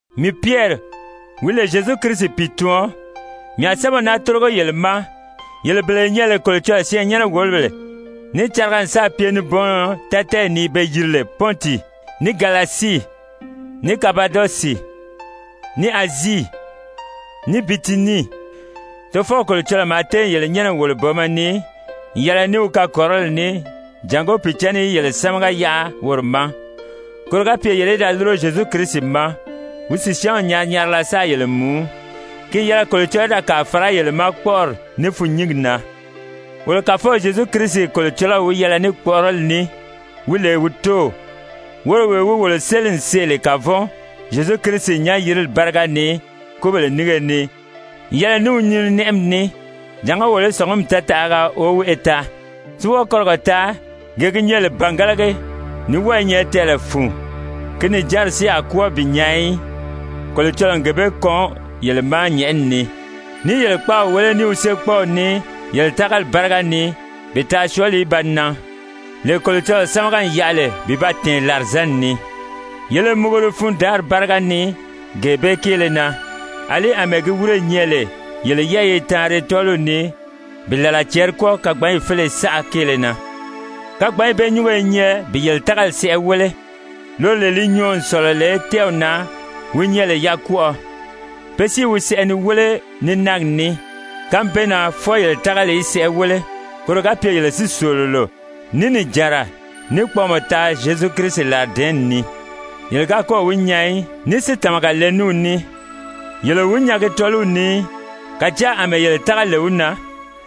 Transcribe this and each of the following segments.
Mii Pyɛri, wi lè Zyezu Kirisi pìituɔn, mii a sɛ́bɛw naa tórigo yele ma, yele bele ye nyɛ lè Kolocɔlɔɔ syɛɛnnyɛnɛ-wòlobèle níì cariga n sáà pye nibɔɔnnɔ tátɛɛyi ni be yiri lè Pɔnti, ní Galasii, ní Kapadɔsi, ní Azii, ní Bitinii. Tofɔw Kolocɔlɔɔ maa téè yele nyɛ́nɛ n wòlo booma ni n yɛlɛ ní wi kakɔrirɔli ní jàngó Pìicǎnni í yele sámaga yaʔa woro ma, koro ga pye yele í da lúro Zyezu Kirisi ma, wi sìsyaanw nyari-nyarila sáā yele mùú. Ki n yɛlɛ Kolocɔlɔɔ í da kàa fàrá yele ma kpɔ́ʔɔri ní fûnnyingi na. Wolo Kàfɔw Zyezu Kirisi Kolocɔlɔw wi yɛlɛ ní kpɔ̀ʔɔrɔli ní, wi lè wi Tóow, woro wee wi wolo séli n see lè kavɔn Zyezu Kirisi nyán-yirili báriga ni kúbèle nínge ni n yɛlɛ ní wi nyininɛʔɛmi ní, jàngó wolo í sɔ̀ngumɔ tɛɛtaʔaga woweʔe taa, si wɔ́ɔ kɔrigɔ taa, gee gi nyɛ lè bàngalagi, ní wɔ́ɔ i nyɛ tɛɛlɛ fun, ki nìjanri si a kwɔ́ɔ bi nyaa í. Kolocɔlɔɔ n gee bee kɔn yele ma nyɛ̀ʔɛni ni, ní i yele kpáaw wéle ní wi séekpɔɔw ní yele tágali báriga ni bi taa syɔɔli í ba nan, lee Kolocɔlɔɔ sámaga n yaʔa lè bi ba tɛ̀ɛn làrizanni ni. Yele i muguri fundaanri báriga ni gee bee kéele na, àlí àmɛɛ gi wírē nyɛ lè yele yɛ́ɛyi i taanri tɔ́ɔliw ni bi làla cɛɛri kwɔ́ɔ kagbanyi féleye saʔa kéele na. Kagbanyi bee nyúngo i nyɛ bi yele tágali sɛʔɛ wéle, loro lee li nyɔɔ n sɔ̀lɔ lè tɛ́ɛw na wi nyɛ lè yakwɔʔɔ, pe si i wi sɛʔɛ ni wéle ní náagi ní, kánmi bee na fwɔɔ yele tágali í sɛʔɛ wéle koro ga pye yele si sòololo, ní nìjanra, ní kpɔɔmɔ taa Zyezu Kirisi làridɛ̀ɛ́nni ni. Yele ga kɔ́ɔ̀ wi nyaa í, ní si tàmaga le ní wi ní. Yele o wi nyaagi tɔ́ɔliw ni í, kàjáa àmɛɛ yele tága lè wi na,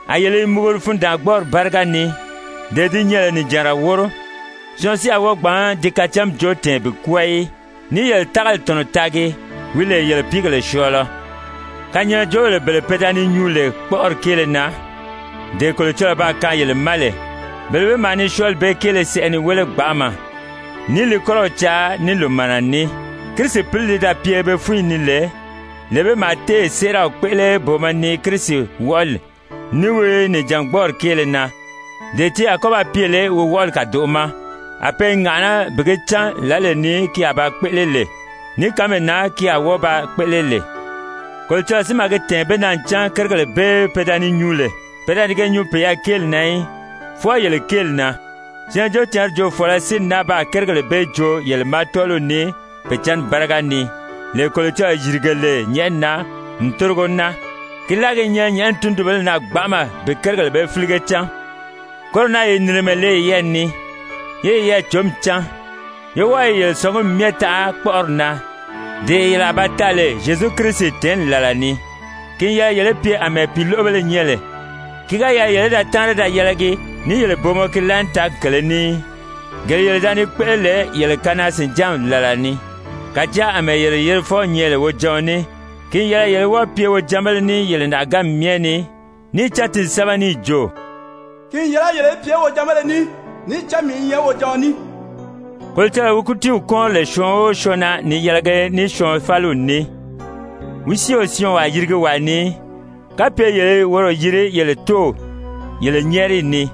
a yele i muguri fundaangbɔɔri báriga ni, dee di nyɛ lè nìjanra wóro, syɔɔn si a wɔ́ɔ gbǎn di kacánmi joo tɛ̀ɛn bi kwɔ́ɔ í, ní i yele tágali tɔ̀nɔ taagi, wi lè yele pìígèle syɔɔlɔ. Kanyaajoobèle bele pe da ni nyuu lè kpɔ́ʔɔri kéele na, dee Kolocɔlɔɔ baa kaan yele ma lè, bele bee maa ni syɔɔli bee kéele sɛʔɛ ni wéle gbanʔama, ní i li kɔ́rɔw caa ní lòmaana ní. Kirisi Pǐli li da pye be fúnyi ni lè, lee bee maa téè séeraw kpéʔele booma ni Kirisi wɔʔɔli ní wi nìjangbɔɔri kéele na, dee ti a kɔ́ ba pye lè wi wɔʔɔli kàdoʔo ma, a pe i ŋàʔaná bi gi cán lǎlee ni ki a ba kpéʔele lè, ní kánmee na ki a wɔ́ɔ ba kpéʔele lè. Kolocɔlɔɔ si maa gi tɛ̀ɛn be na ncan kérigèle bee pe da ni nyuu lè, pe da ni ge nyuu peyɛɛ kéeli na í, fwɔɔ yele kéeli na. Syɛɛnjóocǎnri joofɔɔlɔ si n náa baa kérigèle bee joo yele ma tɔ́ɔliw ni Pìicǎnni báriga ni, lee Kolocɔlɔɔ yìrige lè nyɛ̀ʔɛni na n tórigo naa, ki láagi i nyɛ nyɛ̀ʔɛni tundunbéle na gbanʔama bi kérigèle bee fílige cán. Koro na ye nìrimɛ le yeyɛɛ ni, yé yeyɛɛ cǒmi cán, yé wɔ́ɔ yele sɔ̀ngumi myɛ taʔa kpɔ́ʔɔri na, dee yele a ba taa lè Zyezu Kirisi tɛ̀ɛ́nni làla ni. Ki n yɛlɛ yele í pye àmɛɛ pìiloʔobéle nyɛ lè, ki ga yɛlɛ yele í da táanri da yɛlɛgi ní yele booma ki laànitaagi kèlē ní í, gele yele da ni kpéʔele lè yele kanaa-sìnjánmi làla ni. Kàjáa àmɛɛ yele Yerifɔw nyɛ lè wojaɔn ní, ki n yɛlɛ yele í wɔ́ɔ pye wojanbéle ní yele nàʔaganmi myɛ ni, níì cán ti n sɛ́bɛ níì jo: «Ki n yɛlɛ yele í pye wojanbéle ní, níì cán mii i nyɛ wojaɔn ní.» Kolocɔlɔɔ wi kútiiw kúunri lè syɔɔn o syɔɔn na ni yɛlɛgi ní syɔɔn fáliw ní, wi si o syɔɔnwaa yirigi wàa ni í, kapye yele i woro yiri yele Tóow yele nyɛ́ɛriyi ni,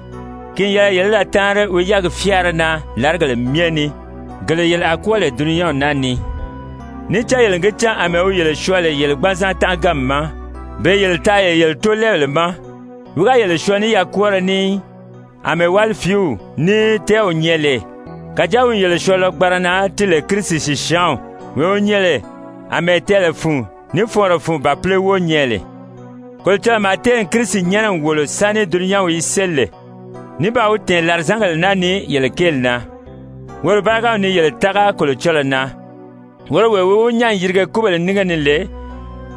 ki n yɛlɛ yele í da táanri wi yɛ́ɛgi fyáara na làrigèle myɛ ni, gele yele a kwɔ́ɔ lè dulunyanw naa ni. Níì cán yele n gi cán àmɛɛ wi yele syɔɔ lè yele gbanzan tánʔaganmi ma, bee yele taa lè yele tóolɛɛbèle ma, wi ga yele syɔɔ ní yakwɔɔrɔ ní í, àmɛɛ wálifiiw ní tɛ́ɛw nyɛ lè. Kàjáa wi n yele syɔɔ lɔgbanra na ti lè Kirisi sìsyaanw, wee wi nyɛ lè àmɛɛ tɛɛlɛ fun ní fɔɔnrɔ fun bàpile wóo nyɛ lè. Kolocɔlɔɔ maa téè Kirisi nyɛ́nɛ n wòlo sáni dulunyanw í séli lè, ní baa wi tɛ̀ɛn làrizangèle naa ni yele kéeli na. Woro bárigaw ni yele tága Kolocɔlɔɔ na, woro wee wi wi nyán n yirige kúbèle nínge ni lè,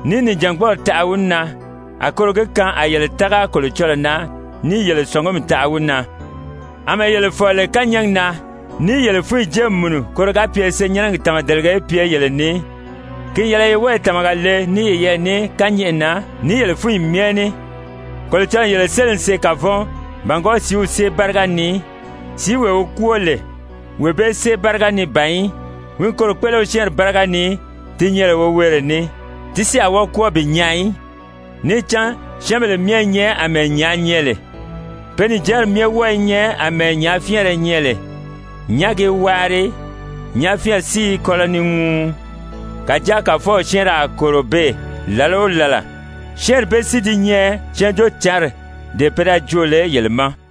níì nìjangbɔɔri taʔa wi na, a koro gi kaan a yele tága Kolocɔlɔɔ na níì yele sɔ̀ngumi taʔa wi na. Amɛɛ yele fɔ̀lɔ lè kányɛɛgi na níì yele fúnyi jée n mùnu koro ga pye senyɛnnɛgi tàmadelege í pye yele ni, ki n yɛlɛ ye wɔ́ɔ tàmaga le ní yeyɛɛ ní kányɛʔɛ na ní yele fúnyi myɛ ní. Kolocɔlɔɔ n yele séli n see kavɔn bàngwɔɔ sìíw sée báriga ni, sìíwee wi kwóo lè, wee bee sée báriga ni ban í, wi n koro kpéʔele wi syɛ́ɛnri báriga ni ti nyɛ lè woweere ní, ti si a wɔ́ɔ kwɔ́ɔ bi nyaa í. Níì cán: «Syɛ́ɛnbèle myɛ i nyɛ àmɛɛ nyàā nyɛ lè, pe nìjanri myɛ wɔ́ɔ i nyɛ àmɛɛ nyàáfyɛɛnrɛ nyɛ lè, nyàági i waari, nyàáfyɛɛnri si i kɔlɔ ni ŋuu, Kàjáa Kàfɔw syɛ́ɛnrɛ a kòro beè làla o làla.» Syɛ́ɛnri bee si di nyɛ Syɛɛnjóocǎnri, dee pe da joo lè yele ma.